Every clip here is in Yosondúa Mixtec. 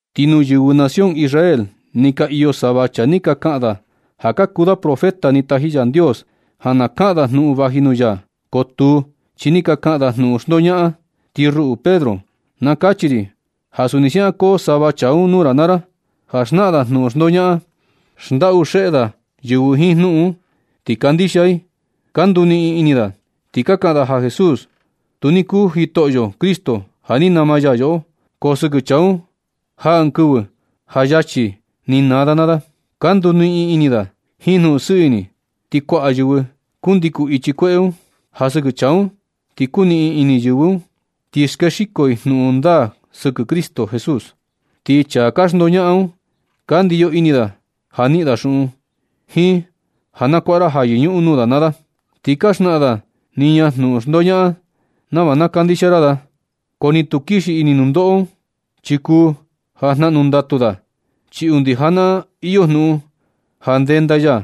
Ti nuu yɨvɨ nación Israel ni ka iyo sava chaa ni ka kaꞌan da ja ka kuu da profeta ni taji Yandios ja na kaꞌan da jnuꞌun vaji nuu ya. Ko tuu, chi ni ka kaꞌan da jnuꞌun xndoñaꞌan. Ti ruꞌu Pedro, na kachi ri ja suni siaꞌan koo sava chaa un nuu ra naa ra ja xnaꞌan da jnuꞌun xndoñaꞌan. Xndaꞌu xeꞌe da yɨvɨ jiin jnuꞌun un, ti kandixia i, ka nduniꞌin ini da, ti ka kaꞌan da ja Jesús tu ni kuu Jitoꞌo Cristo ja ni nama ya yoꞌo. Ko sɨkɨ chaa un jaa ɨɨn kɨvɨ ja yachi ni naa da naa da. Ka nduniꞌin ini da jiin jnuꞌun sɨɨ ini, ti kuaꞌa yɨvɨ kundikun i ichi kueꞌe un. Ja sɨkɨ chaa un ti kuniꞌin ini yɨvɨ, ti skexiko i jnuꞌun ndaa sɨkɨ Cristo Jesús. Ti chaa ka xndoñaꞌan un, ka ndiyo ini da ja niꞌin da xuꞌun, jiin ja na kuaꞌa ra ja ja yɨñuꞌun nuu da naa da. Ti ka xnaꞌan da niña jnuꞌun xndoñaꞌan nava na kandixia ra da. Ko ni tu kixi ini nundoꞌo, chi kuu ja jnaꞌnu ndatu da, chi undi janaꞌan iyo jnuꞌun ja ndenda ya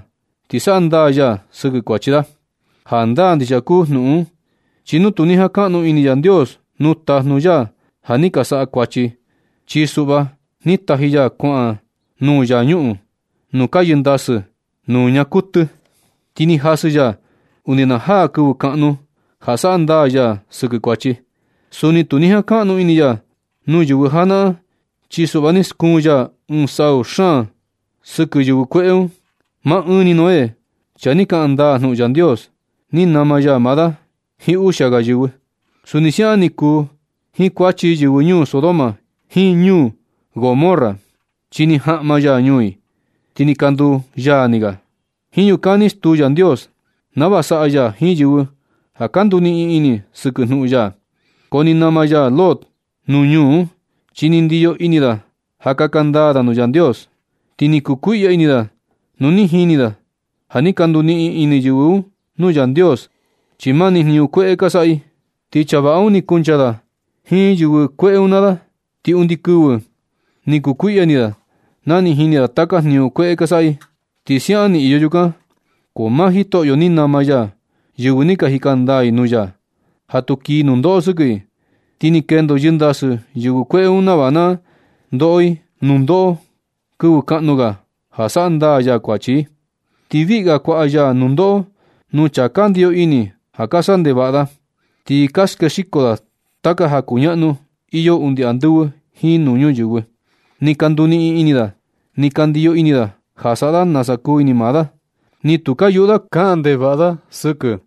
ti saꞌa ndaa ya sɨkɨ kuachi da. Jandaa ndixia kuu jnuꞌun un, chi nu tu ni jankaꞌnu ini Yandios nuu tajnu ya ja ni ka saꞌa kuachi, chi suꞌva ni taji ya kuaꞌan nuu infiernu nuu ka yɨndasɨ nuu ñaa kuɨtɨ. Ti ni jasɨ ya undi na jaa kɨvɨ kaꞌnu ja saꞌa ndaa ya sɨkɨ kuachi. Suni tu ni jankaꞌnu ini ya nuu yɨvɨ janaꞌan, chi suꞌva ni skuun ya ɨɨn sau xaan sɨkɨ yɨvɨ kueꞌe un. Maa ɨɨn ni Noé, chaa ni kaꞌan ndaa jnuꞌun Yandios, ni nama ya maa da jiin uxia ga yɨvɨ. Suni siaꞌan ni kuu jiin kuachi yɨvɨ ñuu Sodoma jiin ñuu Gomorra, chi ni jaꞌma ya ñuu i, ti ni ka nduu yaa ni ga. Jiin yukan ni stuu Yandios nava saꞌa ya jiin yɨvɨ ja ka nduniꞌin ini i sɨkɨ jnuꞌun ya. Ko ni nama ya Lot nuu ñuu un, chi ni ndiyo ini da ja kaka ndaa da nuu Yandios. Ti ni kukuiꞌya ini da nu ni jini da ja ni ka nduniꞌin ini yɨvɨ un nuu Yandios, chi mani jniñu kueꞌe ni ka saꞌa i. Ti chaa vaꞌa un ni kuncha da jiin yɨvɨ kueꞌe un naa i, ti ndɨ kɨvɨ ni kukuiꞌya ini da ja ni jini da taka jniñu kueꞌe ka saꞌa i. Ti siaꞌan ni iyo yukan, ko maa Jitoꞌo ni nama ya yɨvɨ ni ka jika ndaa i nuu ya, ja tu kii nundoꞌo sɨkɨ i. Ti ni kendo yɨndasɨ yɨvɨ kueꞌe un nava na ndoꞌo i nundoꞌo kɨvɨ kaꞌnu ga ja saꞌa ndaa ya kuachi i. Ti viꞌi ga kuaꞌa ya nundoꞌo kuu chaa ka ndiyo ini ja saꞌa ndevaꞌa da, ti ka skexiko da taka ja kuñaꞌnu iyo undi andɨvɨ jiin nuu ñuyɨvɨ. Ni ka nduniꞌin ini da, ti ka ndiyo ini da ja saꞌa da nasa kuu ini maa da, ti tu ka yuꞌu da kaꞌan ndevaꞌa da sɨkɨ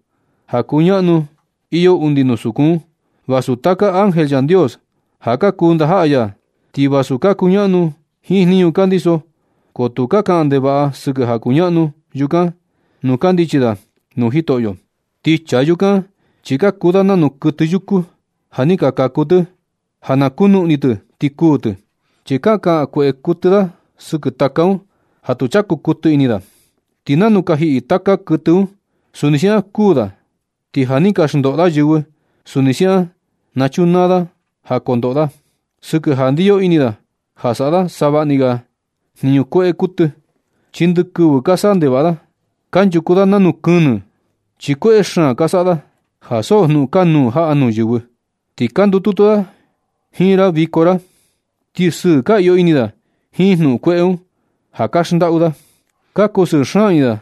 ja kuñaꞌnu iyo undi nuu sukun un, vasu taka ángel Yandios, ja ka kuu ndajaꞌa ya, ti vasu ka kuñaꞌnu jiin jniñu ka ndiso. Ko tu ka kaꞌan ndevaꞌa da sɨkɨ ja kuñaꞌnu yukan nu kandichi da nuu Jitoꞌo. Ti chaa yukan chi ka kuu da nanu kuɨtɨ yuku ja ni ka kaku tɨ ja na kunuꞌni tɨ ti kuu tɨ. Chi ka kaꞌan kueꞌe kuɨtɨ da sɨkɨ taka un ja tu chaku kuɨtɨ ini da. Ti nanu ka jiꞌi taka kuɨtɨ un, suni siaꞌan kuu da. Ti ja ni ka xndoꞌo da yɨvɨ, suni siaꞌan na na chunaa da ja kondoꞌo da. Sɨkɨ ja ndiyo ini da ja saꞌa da savaꞌni ga jniñu kueꞌe kuɨtɨ, chi ndɨkɨvɨ ka saꞌa ndevaꞌa da. Kanchuku da nanu kɨnɨ, chi kueꞌe xaan ka saꞌa da ja so jnuꞌun kanuu jaꞌa nuu yɨvɨ. Ti ka ndututu da jiin ra viko ra, ti sɨɨ ka iyo ini da jiin jnuꞌun kueꞌe un, ja ka xndaꞌu da. Ka kusɨɨ xaan ini da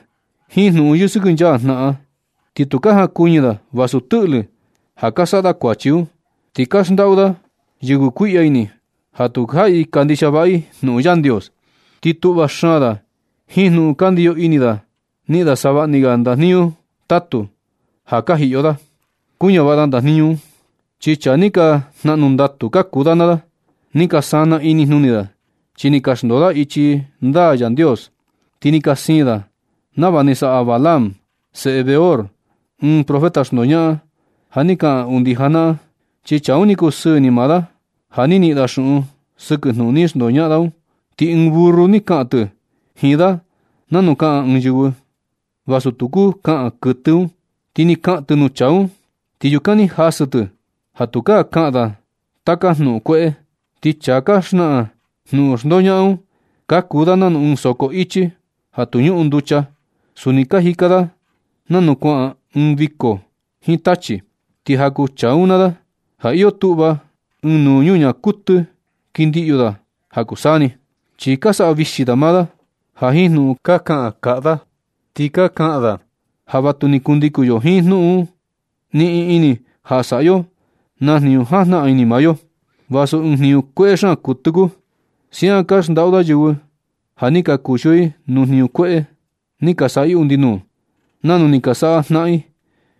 jiin jnuꞌun yɨsɨkɨnchaa jnaꞌan, ti tu ka jankuɨñɨ da vasu tɨꞌlɨ ja ka saꞌa da kuachi un. Ti ka xndaꞌu da yɨvɨ kuiꞌya ini ja tu jaꞌi kandixia vaꞌa i jnuꞌun Yandios. Ti tuꞌva xaan da jiin jnuꞌun ja kandiyo ini da niꞌin da savaꞌni ga ndajniñu tatu ja ka jiꞌyo da kuñavaꞌa da ndajniñu un. Chi chaa ni ka jnaꞌnu ndatu ka kuu da naa da. Ni ka sanaa inijnuni da chi ni ka xndoo da ichi ndaa Yandios. Ti ni ka siin da nava ni saꞌa Balaam, seꞌe Beor, ɨɨn profeta xndoñaꞌan ja ni kaꞌan undi janaꞌan. Chi chaa un ni kusɨɨ ini maa da ja na niꞌin da xuꞌun sɨkɨ jnuꞌun ni xndoñaꞌan da un. Ti ɨɨn burru ni kaꞌan tɨ jiin da nanu kaꞌan ɨɨn yɨvɨ, vasu tu kuu kaꞌan kuɨtɨ un. Ti ni kaꞌan tɨ nuu chaa un, ti yukan ni jasɨ tɨ ja tukaa kaꞌan da taka jnuꞌun kueꞌe. Ti chaa ka xnaꞌan jnuꞌun xndoñaꞌan un, ka kuu da nanu ɨɨn soko ichi ja tu ñuꞌun nducha. Suni ka jika da nanu kuaꞌan ɨɨn viko jiin tachi. Ti ja kuu chaa un naa da ja iyo tuꞌva ɨɨn nuu ñuñaa kuɨtɨ kɨndiꞌyu da ja kuu saa ni. Chi ka saꞌa vixi da maa da jiin jnuꞌun ka kaꞌan kaꞌa da, ti ka kaꞌan da ja vatuni kundikun yo jiin jnuꞌun niꞌin ini ja saꞌa yo na jniñu jajnaꞌan ini maa yo, vasu ɨɨn jniñu kueꞌe xaan kuɨtɨ kuu. Siaꞌan ka xndaꞌu da yɨvɨ ja ni ka kuxio i nuu jniñu kueꞌe ni ka saꞌa i undi nuu, nanu ni ka saꞌa jnaꞌan i.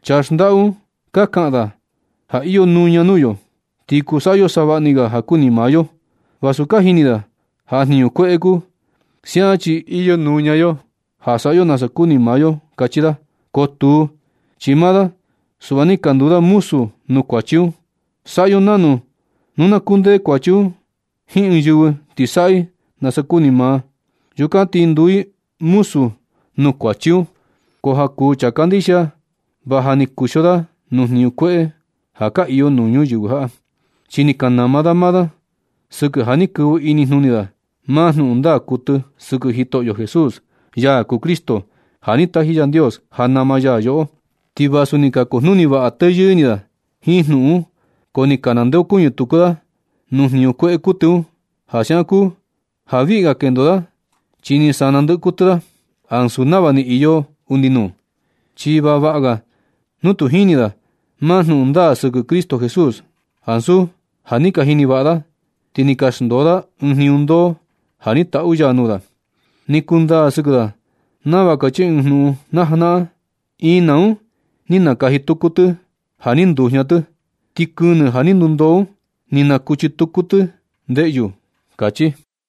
Chaa xndaꞌu un, ka kaꞌan da ja iyo nuña nuu yo, ti kuu saꞌa yo savaꞌni ga ja kuni maa yo, vasu ka jini da ja jniñu kueꞌe kuu. Siaꞌan chi iyo nuña yo ja saꞌa yo nasa kuni maa yo kachi da. Ko tuu, chi maa da suꞌva ni ka nduu da muzu nuu kuachi un. Saꞌa yo nanu. Nu na kundee kuachi un jiin ɨɨn yɨvɨ ti saꞌa i nasa kuni maa, yukan ti ni nduu i muzu nuu kuachi un. Ko ja kuu chaa kandixia, va ja ni ka kuxio da nuu jniñu kueꞌe ja ka iyo nuu ñuyɨvɨ jaꞌa, chi ni ka nama da maa da sɨkɨ ja ni kɨvɨ inijnuni da maa jnuꞌun ndaa kuɨtɨ sɨkɨ Jitoꞌo Jesús, ya kuu Cristo ja ni taji Yandios ja nama ya yoꞌo. Ti vasu ni ka kujnuni vaꞌa teyɨɨ ini da jiin jnuꞌun un, ko ni ka nandeokuñɨ tuku da nuu jniñu kueꞌe kuɨtɨ un, ja siaꞌan kuu ja viꞌga kendo da chi ni sana ndɨꞌɨ kuɨtɨ da, ansu nava ni iyo undi nuu. Chi va vaꞌa ga nu tu ni jini da maa jnuꞌun ndaa sɨkɨ Cristo Jesús, ansu ja ni ka jini vaꞌa da, ti ni ka xndoo da ɨɨn jniñu ndoo ja ni taꞌu ya nuu da. Ni kundaa sɨkɨ da nava kachi ɨɨn jnuꞌun na janaꞌan: “Ina un ni nakaji tuku tɨ ja ni ndujña tɨ. Ti kɨnɨ ja ni ndundoo un, ni nakuchi tuku tɨ ndeꞌyu”, kachi.